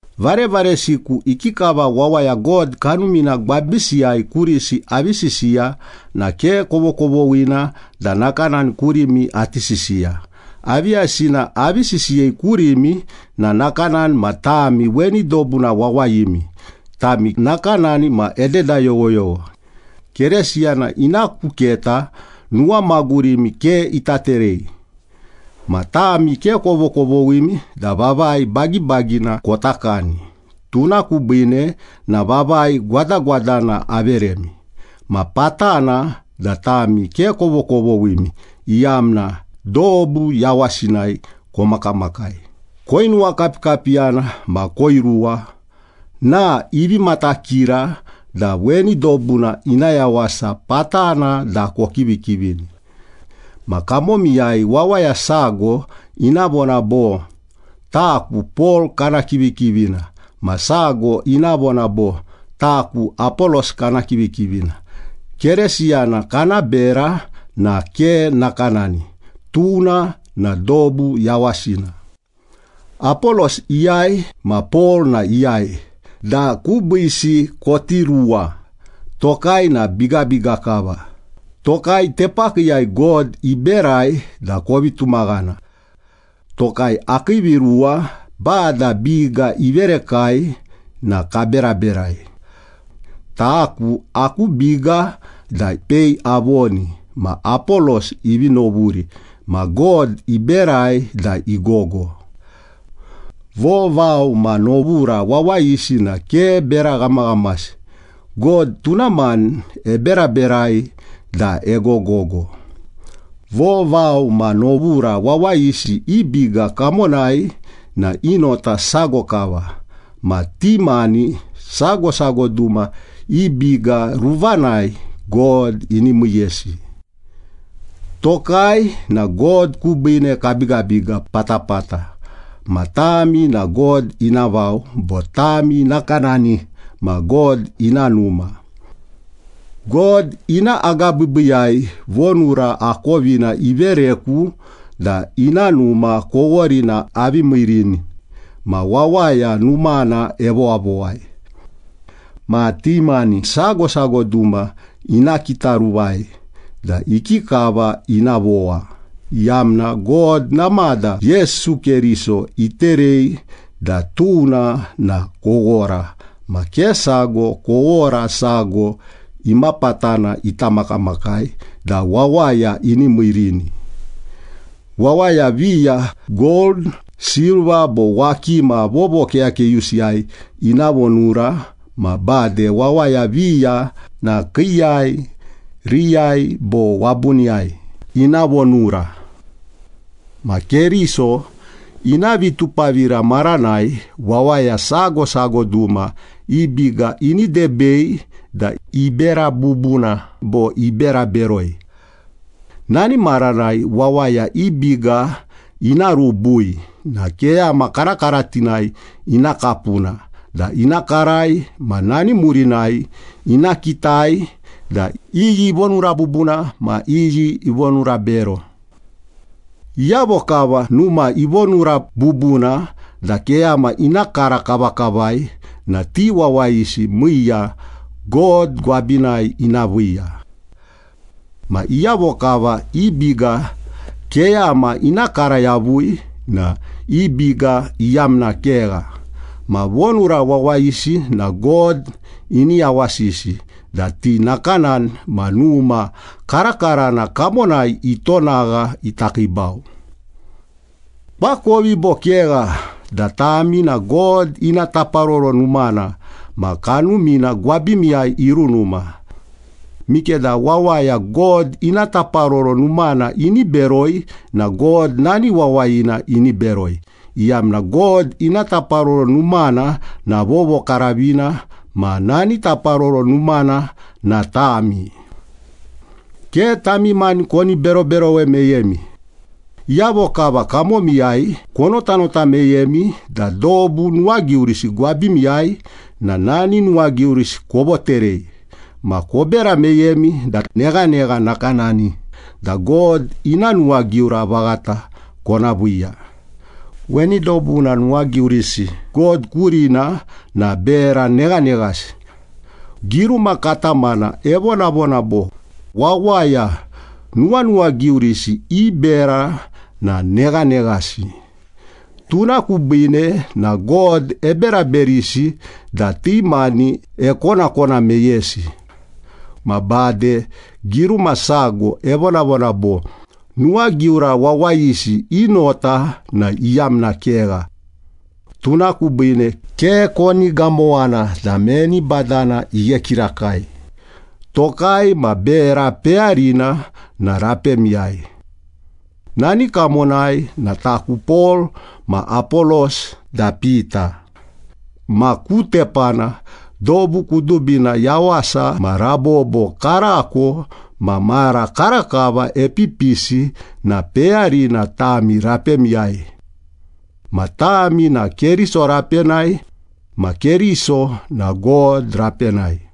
Varevaresiku, ikikava wawaya God Kanumina gwabisiyai kurisi avi sisiya na ke kovokovoghina da nakanani kurimi ati sisiya. Aviyavisina avi sisiyei kurimi na nakanani ma tami weni dobuna wawayimi, tami nakanani ma ededa yoghoyogho. Keresiyana ina ku keta nuwamagurimi ke ita terei. Ma tami ke kovokovoghimi da vavai bagibagina kota kani, tuna kubiine na vavai gwadagwadana averemi. Ma patana da tami ke kovokovoghimi, iyamna dobu yawasinai komakamakai, koinuwakapikapiyana ma koiruwa na ivi matakira da weni dobuna ina yawasa patana da kokivikivini. Ma kamomiyai wawaya sago ina vona bo, “Taku Pol kana kivikivina.” Ma sago ina vona bo, “Taku Apolos kana kivikivina.” Keresiyana kana bera na ke nakanani, tuna na dobu yawasina. Apolos iyai ma Pol na iyai da kubiisi koti ruwa? Tokai na bigabiga kava, tokai tepakiiyai God iberai da kovi tumaghana. Tokai, akii viruwa Bada biga iverekai na kaberaberai. Taku aku biga da pei avoni, ma Apolos ivi novuri ma God iberai da igogo. Vovao ma novura wawayisi na ke bera ghamaghamasi. God tuna mani eberaberai da egogogo. Vovao ma novura wawayisi i biga kamonai na i nota sago kava. Ma ti mani sago sago duma i biga ruvanai God ini miiyesi. Tokai na God kubiine kabigabiga patapata ma tami na God ina vao, bo tami nakanani ma God ina numa. God ina agabiibiiyai vonura akovina ivereku da ina numa koworina avi miirini, ma wawaya numana evowavowai. Ma ti mani sago sago duma ina kitaruvai da ikikava ina vowa, iyamna God namada Yesu Keriso iterei da tuna na kowora ma ke sago kowora sago imapatana ita makamakai da wawaya ini miirini. Wawaya viya gold, silva bo wakima vovokeyakeyusiyai ina vonura ma bade wawaya viya na kiiyai, riyai bo wabuniyai ina vonura. Ma Keriso ina vitupavira maranai wawaya sago sago duma i biga ini debei da ibera bubuna bo ibera beroi. Nani maranai wawaya i biga ina rubui na keyama karakaratinai ina kapuna da ina karai ma nani murinai ina kitai da iyi ivonura bubuna ma iyi ivonura bero. Iyavo kava numa ivonura bubuna da keyama ina kara kavakavai na ti wawayisi miiya God gwabinai ina viiya. Ma iyavo kava i biga keyama ina kara yavui na i biga iyamna kegha, ma vonura wawayisi na God ini yawasisi da ti nakanani ma numa karakarana kamonai itonagha ita kiibau. Koakovi bo kegha da tami na God ina taparoro numana ma Kanumina gwabimiyai irunuma? Mikeda wawaya God ina taparoro numana ini beroi na God nani wawayina ini beroi, iyamna God ina taparoro numana na vovokaravina ma nani taparoro numana na tami. Ke tami mani koni beroberowe meyemi. Iyavo kava kamomiyai konotanota meyemi da dobu nuwagiurisi gwabimiyai na nani nuwagiurisi kovoterei ma kobera meyemi da neghanegha nakanani da God ina nuwagiura vaghata kona viiya. Weni dobuna nuwagiurisi God kurina na bera neghaneghasi. Giruma katamana evonavona bo, “Wawaya nuwanuwagiurisi i bera na neghaneghasi, tuna kubiine na God eberaberisi da ti mani ekonakona meyesi.” Ma bade giruma sago evonavona bo, “Nuwagiura wawayisi i nota na iyamna kegha.” Tuna kubiine ke koni gamowana da meni badana ighe kirakai. Tokai ma bera peyarina na rapemiyai. Nani kamonai na taku Pol, ma Apolos da Pita. Ma ku tepana dobu kudubina, yawasa ma rabobo, karako ma mara karakava epipisi na peyarina tami rapemiyai. Ma tami na Keriso rapenai. Ma Keriso na God rapenai.